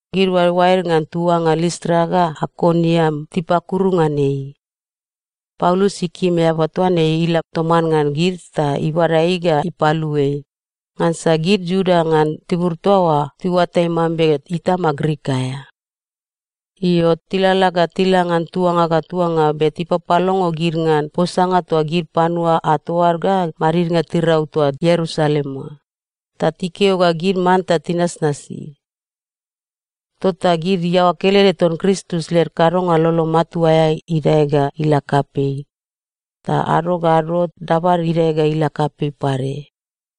Gid oaeoaed ngan tuanga Listra ga Aikoniam tipakuru ngan ei. Paulus ikim eaba toa ne ila toman ngan gid ta ibada ei ga ipalu ei, ngansa gid Iuda ngan tibur toa oa tiuatai mambe itama Grik aea. Io, tilalala ga tila ngan tuanga ga tuanga be tipapalongo gid ngan posanga toa gid panua ato ad ga madidnga tirau toa Ierusalem oa, ta tikeo ga gid manta tinasnasi. Tota gid iaoa kelede ton Kristus led kadonga lolo matua aea idae ga ila kapei, ta ado ga ado dabad idae ga ila kapei pade.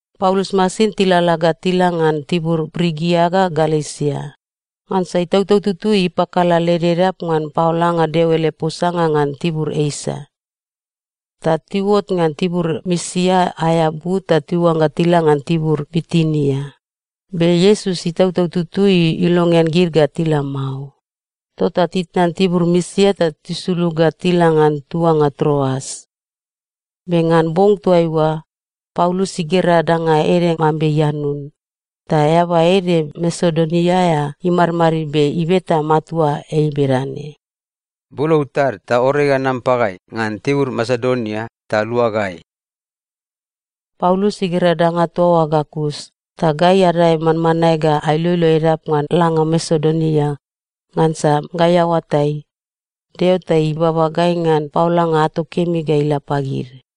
Paulus masin tilalala ga tila ngan tibur Prigia ga Galesia, ngansa Itautau Tutui ipakala led edap ngan paolanga Deo ele posanga ngan tibur Esia. Ta tiuot ngan tibur Misia aea but ta tiuangga tila ngan tibur Bitinia, be Iesus Itautau Tutui ilongean gid ga tila mao. Tota titnan tibur Misia ta tisulug ga tila ngan tuanga Troas. Be ngan bong toaiua, Paulus igera danga ede mambe ianun, ta eaba ede Masedonia aea imadmadid be ibeta matua ei bedane, “Bulou tad ta ore ga nam pagai ngan tibur Masedonia ta lua gai!” Paulus igera danga toa oa ga kus, ta gai adae manmanae ga ailoilo edap ngan langa Masedonia ngansa gai aoatai, Deo ta ibaba gai ngan paolanga ato kemi ga ila pagid.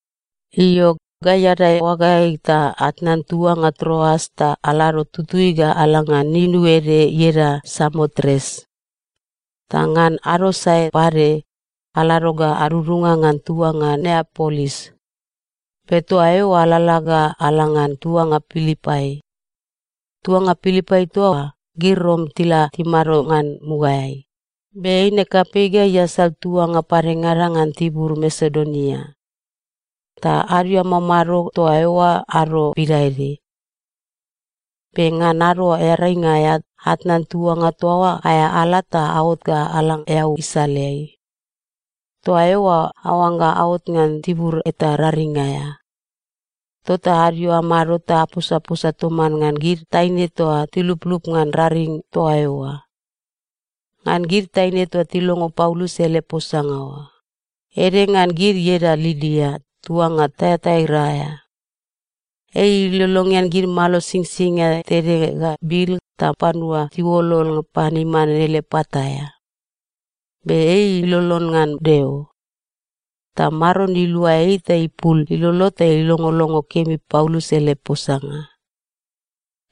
Io, gai adae oagaeai ta atnan tuanga Troas ta alado tutui ga ala ngan inu ede ieda Samotres. Ta ngan ado sae pade, alado ga adudunga ngan tuanga Neapolis. Be toa eoa alalala ga ala ngan tuanga Pilipai. Tuanga Pilipai toa, gid Rom tila timado ngan mugaeai, be eine kapei ga iasal tuanga padengada ngan tibur Masedonia. Ta adio amamado toa eoa ado pidaede. Be ngan Ado Earainga aea atnan tuanga toa oa aea ala ta aot ga ala eau isaleai. Toa eoa aoangga aot ngan tibur eta raring aea. Tota adio amado ta aposaposa toman ngan gid taine toa tiluplup ngan raring toa eoa. Ngan gid taine toa tilongo Paulus ele posanga oa, ede ngan gid ieda Lidia tuanga Taiataira aea. Ei ilolongean gid malo singsingia tede ga bil ta panua tiuolol pan iman ele pat aea. Be ei ilolon ngan Deo. Ta Maron ilua ei ta ipul ilolo ta ilongolongo kemi Paulus ele posanga.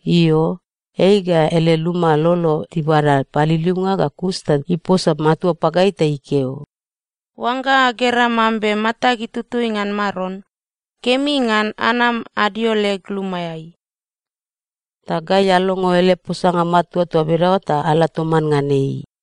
Io, ei ga ele luma lolo tibada paliliunga ga kus ta iposa matua pagai ta ikeo, “Oangga agera mambe matag itutui ngan Maron, kemi ngan anam adio leg lumaeai.” Ta gai alongo ele posanga matua toa bedaoa ta ala toman ngan ei.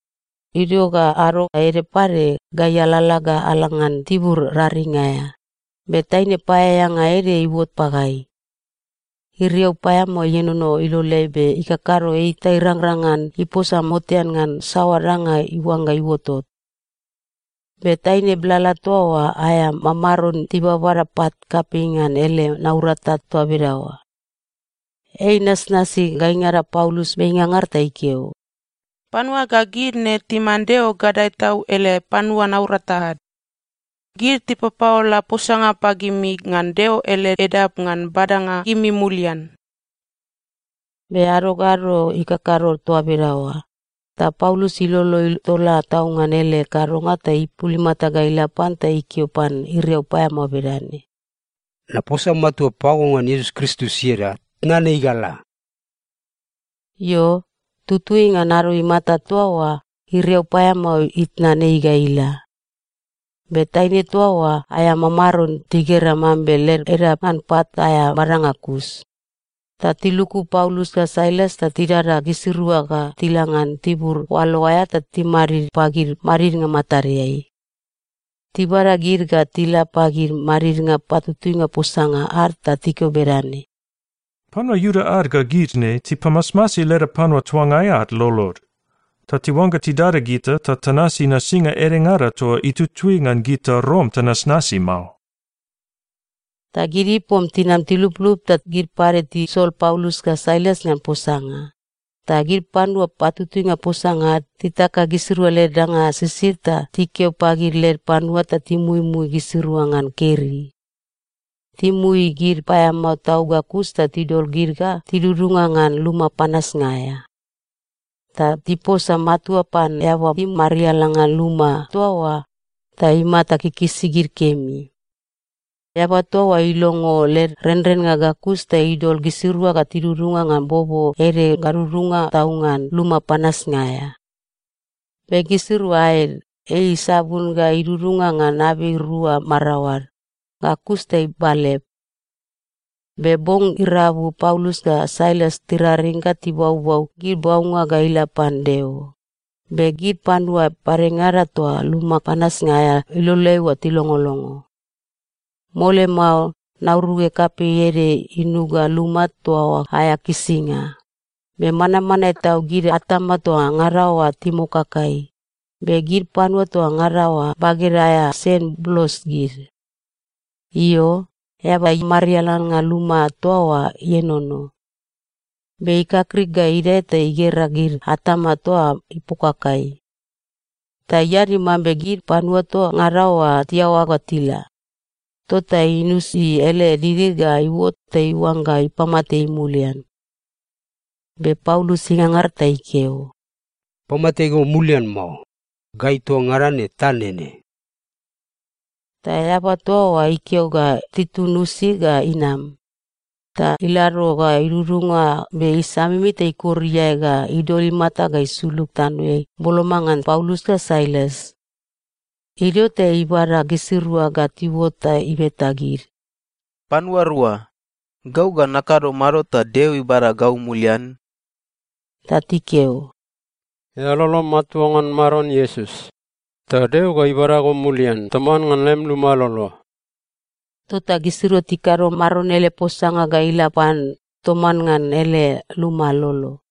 Idio ga ado ede pade, gai alalala ga ala ngan tibur raring aea, be taine paeaeanga ede iuot pagai. Iriau paeamao ienono iloleai be ikakado ei ta irangrang ngan iposa motean ngan saoa danga iuangga iuotot. Be taine blala toa oa aea mamaron tibabada pat kapei ngan ele naurata toa bedaoa. Ei inasnasi gaingada Paulus be ingangar ta ikeo, “Panua ga gid ne timan Deo Gadae Tau ele panua naurata ad. Gid tipapaola posanga pagimi ngan Deo ele edap ngan badanga gimi mulian.” Be ado ga ado ikakado toa bedaoa, ta Paulus ilolo itola tau ngan ele kadonga ta ipul imata ga ila pan ta ikeo pan iriau paeamao bedane, “Naposa matua pago ngan Iesus Kristus ieda, tnan ei ga la!” Io, tutui ngan ado imata toa oa iriau paeamao itnan ei ga ila. Be taine toa oa aea mamaron tigera mambe led edap ngan pat aea badanga kus, ta tiluku Paulus ga Sailas ta tidada gisirua ga tila ngan tibur oalo aea ta timadid pagid madidnga matadeai. Tibada gid ga tila pagid madidnga patutuinga posanga ad ta tikeo bedane, “Panua Iuda ad ga gid ne tipamasmasi leda panua tuangai ad lolod. Ta tiuangga tidada gita ta tanasi nasinga edengada toa itutui ngan gita Rom tanasnasi mao!” Ta gid ipom tinam tiluplup ta gid pade tisol Paulus ga Sailas ngan posanga, ta gid panua patutuinga posanga ad titaka gisirua led danga sisid ta tikeo pagid led panua ta timuimui gisirua ngan keri. Timui gid paeamao tau ga kus ta tidol gid ga tidudunga ngan luma panasnga aea. Ta tiposa matua pan eaba imariala ngan luma toa oa ta imata kikisi gid kemi. Eaba toa oa ilongo led renrennga ga kus ta idol gisirua ga tidudunga ngan bobo ede gadudunga tau ngan luma panasnga aea. Be gisirua aed, ei isabun ga idudunga ngan abei rua maraoad, ga kus ta ibalep. Be bong irabu Paulus ga Sailas tiraring ga tibaubau gid baunga ga ila pan Deo, be gid panua padengada toa luma panasnga aea iloleai oa tilongolongo. Mole mao nauruge kapei ede inuga luma toa oa aea kisinga, be manmanae tau gid atama toa ngada oa imokakai, be gid panua toa ngada oa baged aea sen blos gid. Io, eaba imariala ngan luma toa oa ienono. Be ikakrik ga idae ta igera gid atama toa ipokakai. Ta iadi mambe gid panua toa ngada oa tiaoa ga tila, tota inusi ele didi ga iuot ta iuangga ipamate ei mulian. Be Paulus ingangar ta ikeo, “Pamate go mulian mao! Gai toa ngada ne ta nene.” Ta eaba toa oa ikeo ga titun usi ga inam, ta ilado ga idudunga be isamimi ta ikor iae ga idol imata ga isulug tanoeai boloma ngan Paulus ga Sailas. Idio ta ibada gisirua ga tiuot ta ibeta gid, “Panua rua, gau ga nakado mado ta Deo ibada gau mulian?” Ta tikeo, “Eao lolom matua ngan Maron Iesus, ta Deo ga ibada go mulian toman ngan lem luma lolo.” Tota gisirua tikado Maron ele posanga ga ila pan toman ngan ele luma lolo.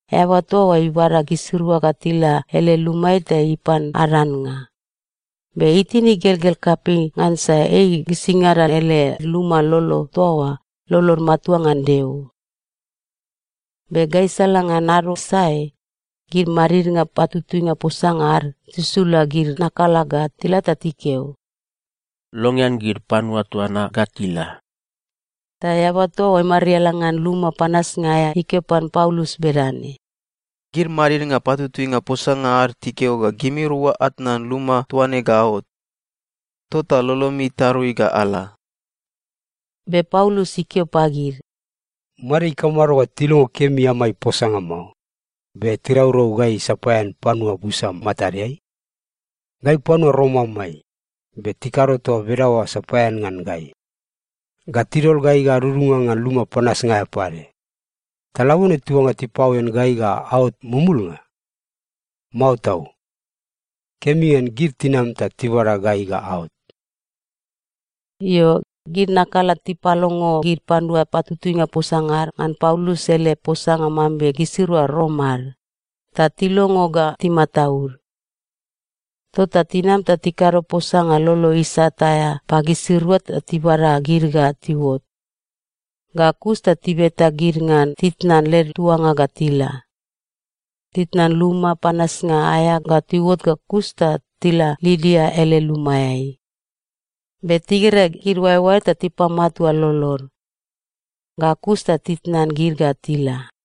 Eaba toa oa ibada gisirua ga tila ele lumaeai ta ipan ad annga, be itin igelgel kapei ngansa ei gisingada ele luma lolo toa oa lolod matua ngan Deo. Be gaisala ngan ado sae, gid madidnga patutuinga posanga ad tisula gid nakala ga tila ta tikeo, “Longean gid panua toa na ga tila.” Ta eaba toa imariala ngan luma panasnga aea ikeo pan Paulus bedane, “Gid madidnga patutuinga posanga ad tikeo ga gimirua atnan luma toa ne ga aot. Tota lolomi tarui ga ala.” Be Paulus ikeo pagid, “Made ikamado ga tilongo kemi amai posanga mao, be tiraurau gai sapaean panua busa matadeai? Gai panua Rom amai, be tikado toa bedaoa sapaean ngan gai. Ga tidol gai ga adudunga ngan luma panasnga aea pade! Ta labone tiuangga tipaoen gai ga aot mumulnga? Mao tau! Kemi ngan gid tinam ta tibada gai ga aot.” Io, gid nakala tipalongo gid panua patutuinga posanga ad ngan Paulus ele posanga mambe gisirua Rom ad, ta tilongo ga timataud. Tota tinam ta tikado posanga lolo isat aea pagisirua ta tibada gid ga tiuot. Ga kus ta tibeta gid ngan titnan led tuanga ga tila. Titnan luma panasnga aea ga tiuot ga kus ta tila Lidia ele lumaeai. Be tigera gid oaeoaed ta tipamatua lolod. Ga kus ta titnan gid ga tila.